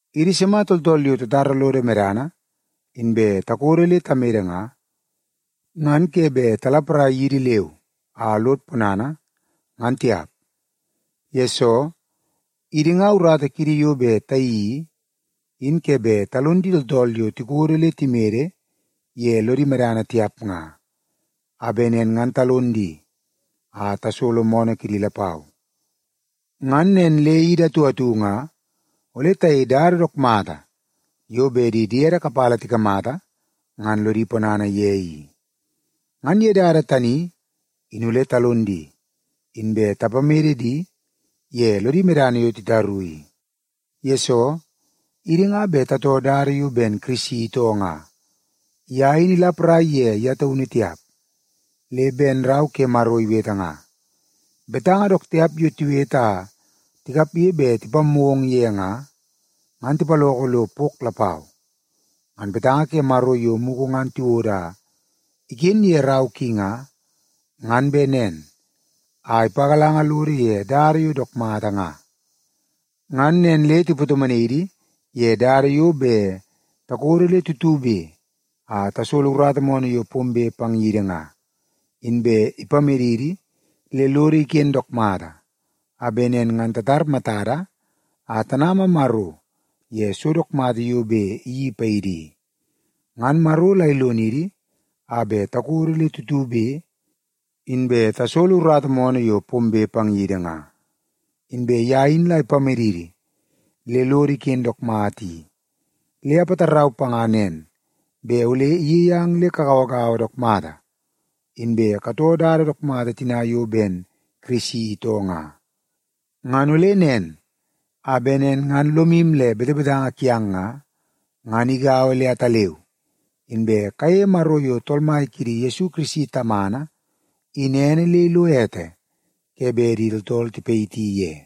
Idi sima tooltool yo tatara lodo medana inbe takodo le tamede nga, ngan ke bet talaparai yidi leu a lod ponana ngan tiap. Yesoo, idi nga urata kiidi yo bet tayeii i, in ke bet talon di tooltool yo tikodo le timede ye lodi medana tiap nga, a bet nen ngan talon di a tasolo moonoo kidi lapau. Ngan nen le idi atu atu nga ole tayei dada dook mata yo bet di diede kapala tikamata ngan lodi ponana ye i. Ngan ye dada tani, in ole talon di, inbe tapamede di ye lodi medana yo titaru i. Yesoo, idi nga bet tatoo dada yo ben Kirisi itoo nga, ye in ilaparai ye ye taunu tiap. Le ben Rau ke Maro iwete nga, “Betanga dook tiap yo tiwete a tikapge bet tipammoo ong ye nga, ngan tipaloko lo pok lapau.” Ngan betanga ke Maro yo mugu ngan tiwodo a iken ye rau ki nga, ngan bet nen a ipagalanga lodo ye dada yo dook mata nga. Ngan nen le ipatomonai idi ye dada yo bet takodo le tutube a tasolo urata moonoo yo pombe pang yidi nga, inbe ipamedidi le lodo iken dook mata, a bet nen ngan tatar matada a tanama Maro ye so dook mata yo bet iyeii paidi i. Ngan Maro la ilonidi a bet takodo le tutube inbe tasolo urata moonoo yo pombe pang yidi nga, inbe ye in la ipamedidi le lodo iken dook mata i, le apatarau panga nen bet ole iyei ang le kagauagaua dook mata, inbe katoo dada dook mata tina yo ben Yesu Kirisi itoo nga. Ngan ole nen, a bet nen ngan lomu le betebetanga kiang nga, ngan igaua le ataleu, inbe kayeie Maro yo Tool Mai kiidi Yesu Kirisi Tamana in ene le ilo ete ke bet di tooltool tipayiti ye.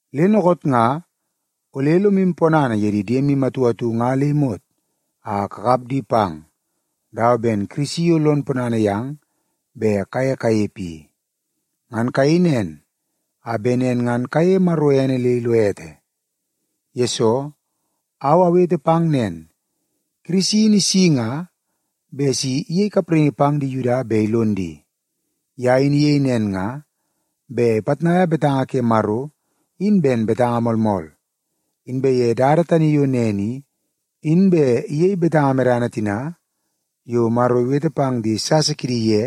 Le dookoot nga, ole lomu ponana ye di diemu atu atu nga le imot a kakap di pang, dawa ben Kirisi yo lon ponana yang bet kaye kanepe i. Ngan kayei nen, a bet nen ngan kayeie Maro ene le ilo ete. Yesoo, au awete pang nen, Kirisi in isi nga bet si iyei kapraingi pang di Yuda bet ilon di. Ye in iyei nen nga bet ipitnaia betanga ke Maro in ben betanga moolmool, inbe ye dada tani yo nen i, in bet iyei betanga medana tina yo Maro iwete pang di sasa kidi ye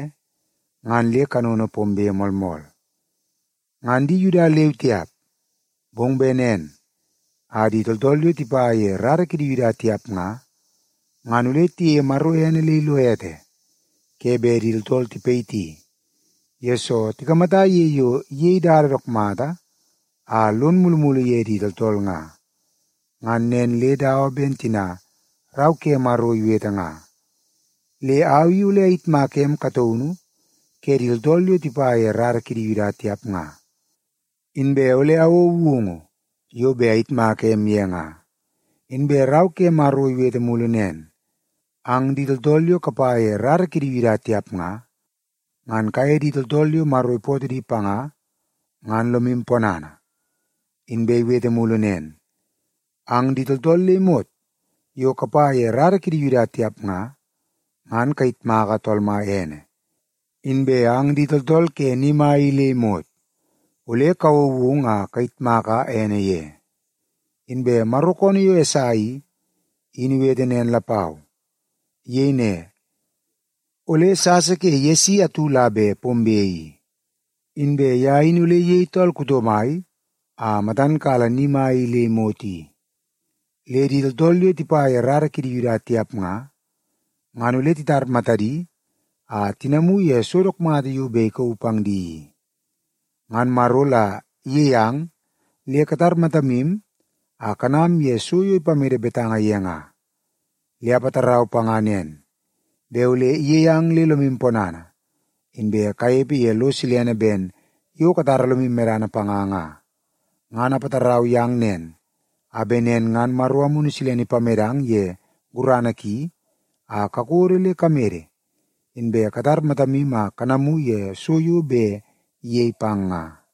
ngan le kanono pombe moolmool. Ngan di Yuda leu tiap, bong bet nen a di tooltool yo tipa ye rara kidi Yuda tiap nga, ngan ole tiyeie Maro ene le ilo ete ke bet di tooltool tipayiti, yesoo tikamata ye yo iyei dada dook mata a lon mulumulu ye di tooltool nga. Ngan nen le dawa ben tina Rau ke Maro iwete nga, “Le au i ole ayitmaka em kataunu ke di tooltool yo tipa ye rara kidi Yuda tiap nga. Inbe ole awouo woungu yo bet ayitmaka em ye nga.” Inbe Rau ke Maro iwete mulu nen, “Ang di tooltool yo kapa ye rara kidi Yuda tiap nga, ngan kaye di tooltool yo Maro ipootoo di panga, ngan lomu ponana.” Inbe iwete mulu nen, “Ang di tooltool le imot yo kapa ye rara kidi Yuda tiap nga, ngan kayitmaka Tool Mai ene. Inbe ang di tooltool ke ni mai i le imot ole kawouo woungu a kayitmaka ene ye.” Inbe Maro koonoo yo Esai i, in iwete nen lapau. Iyei ne, “Ole sasa ke Yesi atu la bet pombe i, inbe ye in ole iyei tool kuto mai a matan kala ni mai i le imot i. Le di tooltool yo tipa ye rara kidi Yuda tiap nga, ngan ole titar matadi a tinamu ye so dook mata yo bet ikauu pang di i.” Ngan Maro la iyei ang le katar matamu a kanam ye so yo ipamede betanga ye nga. Le apatarau panga nen, bet ole iyei ang le lomu ponana, inbe kanepe ye lo silene ben yo katara lomu medana panga nga. Ngan apatarau yang nen, a bet nen ngan Maro Amunu Silene ipamedang ye gurana ki a kakodo le kamede, inbe katar matamu a kanamu ye so yo bet iyei pang nga.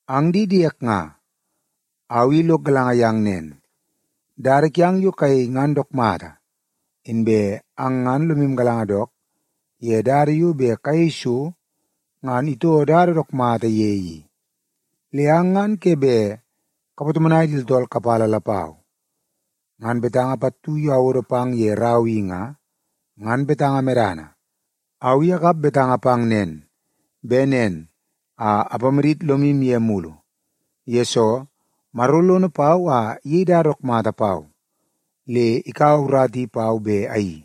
Ang di diek nga, au i lok galanga yang nen, dada kiang yo kayei ngan dook mata, inbe ang ngan lomu galanga dook ye dada yo bet kayei so ngan itoo dada dook mata ye i. Le ang ngan ke bet kapatomonai di tooltool kapala lapau. Ngan betanga pattu yo awodo pang ye rau i nga, ngan betanga medana. Au i akap betanga pang nen, bet nen a apamadit lomu ye mulu, yesoo Maro lono pau a iyei dada dook mata pau le ikaua urata i pau bet ayeii.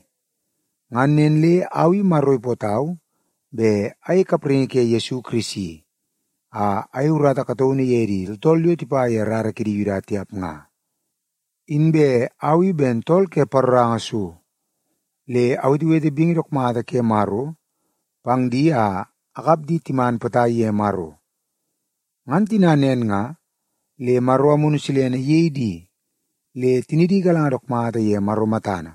Ngan nen le au i Maro ipootau bet ayei kapraingi ke Yesu Kirisi a ayei urata kataunu ye di tooltool yo tipa ye rara kidi Yuda tiap nga. Inbe au i ben tool ke paroranga so, le awetewete bingi dook mata ke Maro pang di a akap di timan potai ye Maro. Ngan tina nen nga, le Maro Amunu Silene iyei di le tinidi igalanga dook mata ye Maro matana,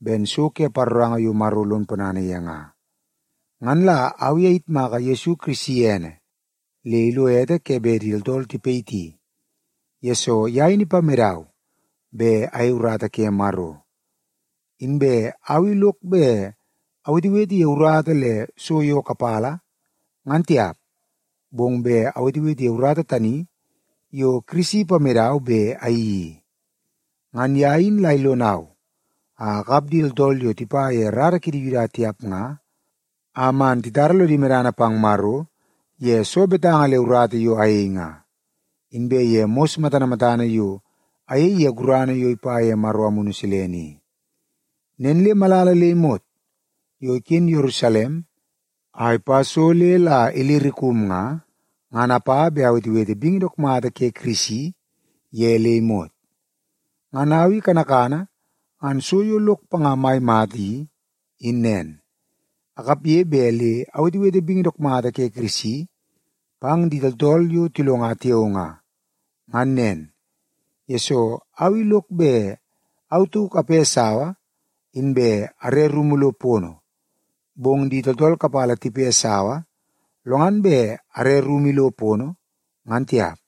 ben so ke paroranga yo Maro lon ponana ye nga. Ngan la au i ayitmaka Yesu Kirisi ene le ilo ete ke bet di tooltool tipayiti, yesoo ye in ipamedau bet ayei urata ke Maro. Inbe au i lok bet awetewete ye urata le so yo kapala, ngan tiap, bong bet awetewete ye urata tani yo Kirisi ipamedau bet ayeii i. Ngan ye in la ilonau a akap di tooltool yo tipa ye rara kidi Yuda tiap nga, a man titara lodi medana pang Maro ye soo betanga le urata yo ayei nga, inbe ye mos matana matana yo ayei ye gurana yo ipa ye Maro Amunu Silene i. Nen le malala le imot yo iken Yerusalem a ipa so le la Ilirikum nga, ngan apa bet awetewete bingi dook mata ke Kirisi ye le imot. Ngan au i kanakana ngan so yo lok panga mai mata i, in nen: Akapge bet le awetewete bingi dook mata ke Kirisi pang di tooltool yo tilonga tiao nga. Ngan nen, yesoo au i lok bet au tauk ape sawa inbe are rumu lo pono, bong di tooltool kapala tipe sawa, lo ngan bet are rumu ilo pono, ngan tiap.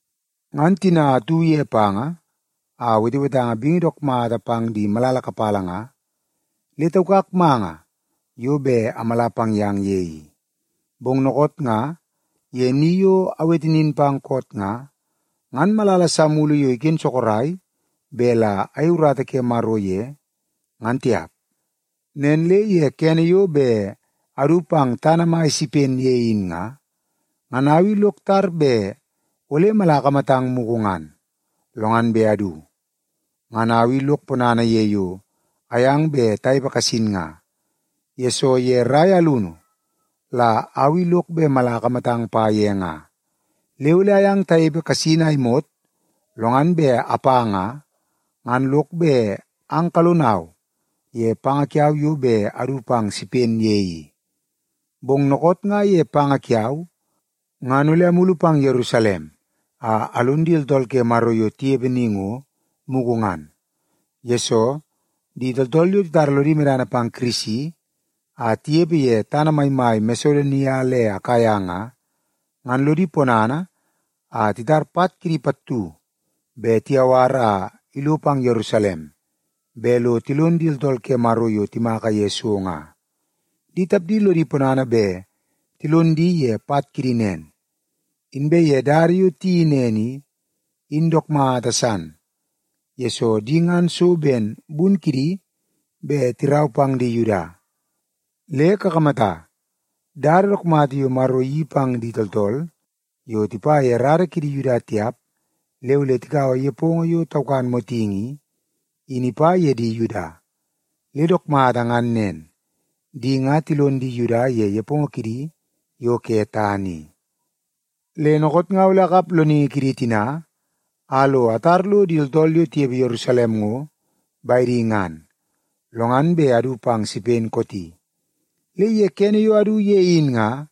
Ngan tina atu ye panga a betebetanga bingi dook mata pang di malala kapala nga, le taukak manga yo bet amala pang yang ye i. Bong dookoot nga ye ni yo awete nin pang koot nga, ngan malala sa mulu yo iken sorok bet la ayei urata ke Maro ye, ngan tiap. Nen le ye kene yo bet adu pang tana mai ke Sipen ye in nga, ngan au i lok tar bet ole mala akamatang mugu ngan, lo ngan bet adu. Ngan au i lok ponana ye yo ayang bet tanepe kasin nga, yesoo ye rai alunu la au i lok bet mala akamatang pa ye nga. Le ole ayang tanepe kasin a imot, lo ngan bet apa nga, ngan lok bet ang kalonau ye panga kiau yo bet adu pang Sipen ye i. Bong dookoot nga ye panga kiau, ngan ole amulu pang Yerusalem a alon di tooltool ke Maro yo tinepe ni ngo, mugu ngan. Yesoo, di tooltool yo titara lodi medana pang Kirisi a tinepe ye tana maimai Masedonia le Akaia nga, ngan lodi ponana a titar pat kidi pattu bet tiyawar lo pang Yerusalem bet lo tilon di tooltool ke Maro yo timaka ye so nga. Di tapdi lodi ponana bet tilon di ye pat kidi nen. Inbe ye dada yo tiyeii nen i, in dook mata san, yesoo di ngan so ben bun kidi bet tirau pang di Yuda. Le kakamata, dada dook mata yo Maro iyeii pang di tooltool yo tipa ye rara kidi Yuda tiap le ole tikaua nepongo yo taukan motingi i, in ipa ye di Yuda. Le dook mata ngan nen, di nga tilon di Yuda ye nepongo kidi yo ke tana i. Le dookoot nga ole akap loningi kidi tina a lo atar lo di tooltool yo tinepe Yerusalem ngo, bedi ngan, lo ngan bet adu pang Sipen kooti. Le ye kene yo adu ye in nga,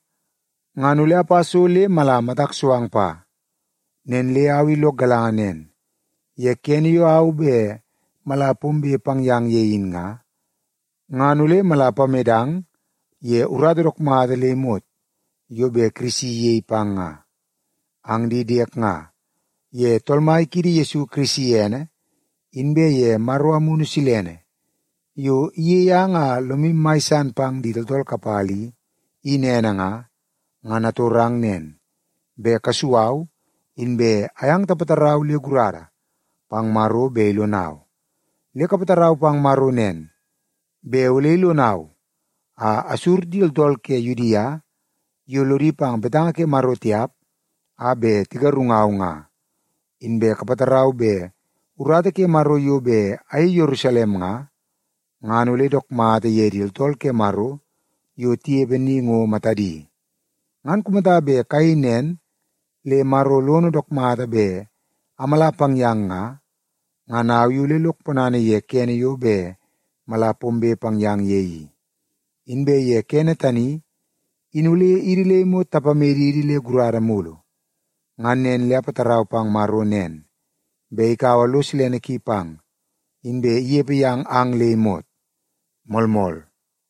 ngan ole apa so le mala matak so ang pa. Nen le au i lok galanga nen, ye kene yo au bet mala pombe pang yang ye in nga, ngan ole mala apamedang ye urata dook mata le imot yo bet Kirisi iyei pang nga. Ang di diek nga, ye Tool Mai kiidi Yesu Kirisi ene, inbe ye Maro Amunu Silene yo iyei ang a lomu mai san pang di tooltool kapala i, in ene nga, ngan atorang nen, bet kasu au inbe ayang tapatarau le gurada pang Maro bet ilonau. Le kapatarau pang Maro nen, bet ole ilonau a asur di tooltool ke Yudia yo lodi pang betanga ke Maro tiap a bet tigarungau nga. Inbe kapatarau bet urata ke Maro yo bet ayei Yerusalem nga, ngan ole dook mata ye di tooltool ke Maro yo tinepe ni ngo, matadi. Ngan kumata bet kayei nen le Maro lono dook mata bet amala pang yang nga, ngan au i ole lok ponana ye kene yo bet mala pombe pang yang ye i. Inbe ye kene tani, in ole idi le imot tapamedidi le gurada mulu. Ngan nen le apatarau pang Maro nen, bet ikaua lo silene ki pang, inbe inepe yang ang le imot. Moolmool.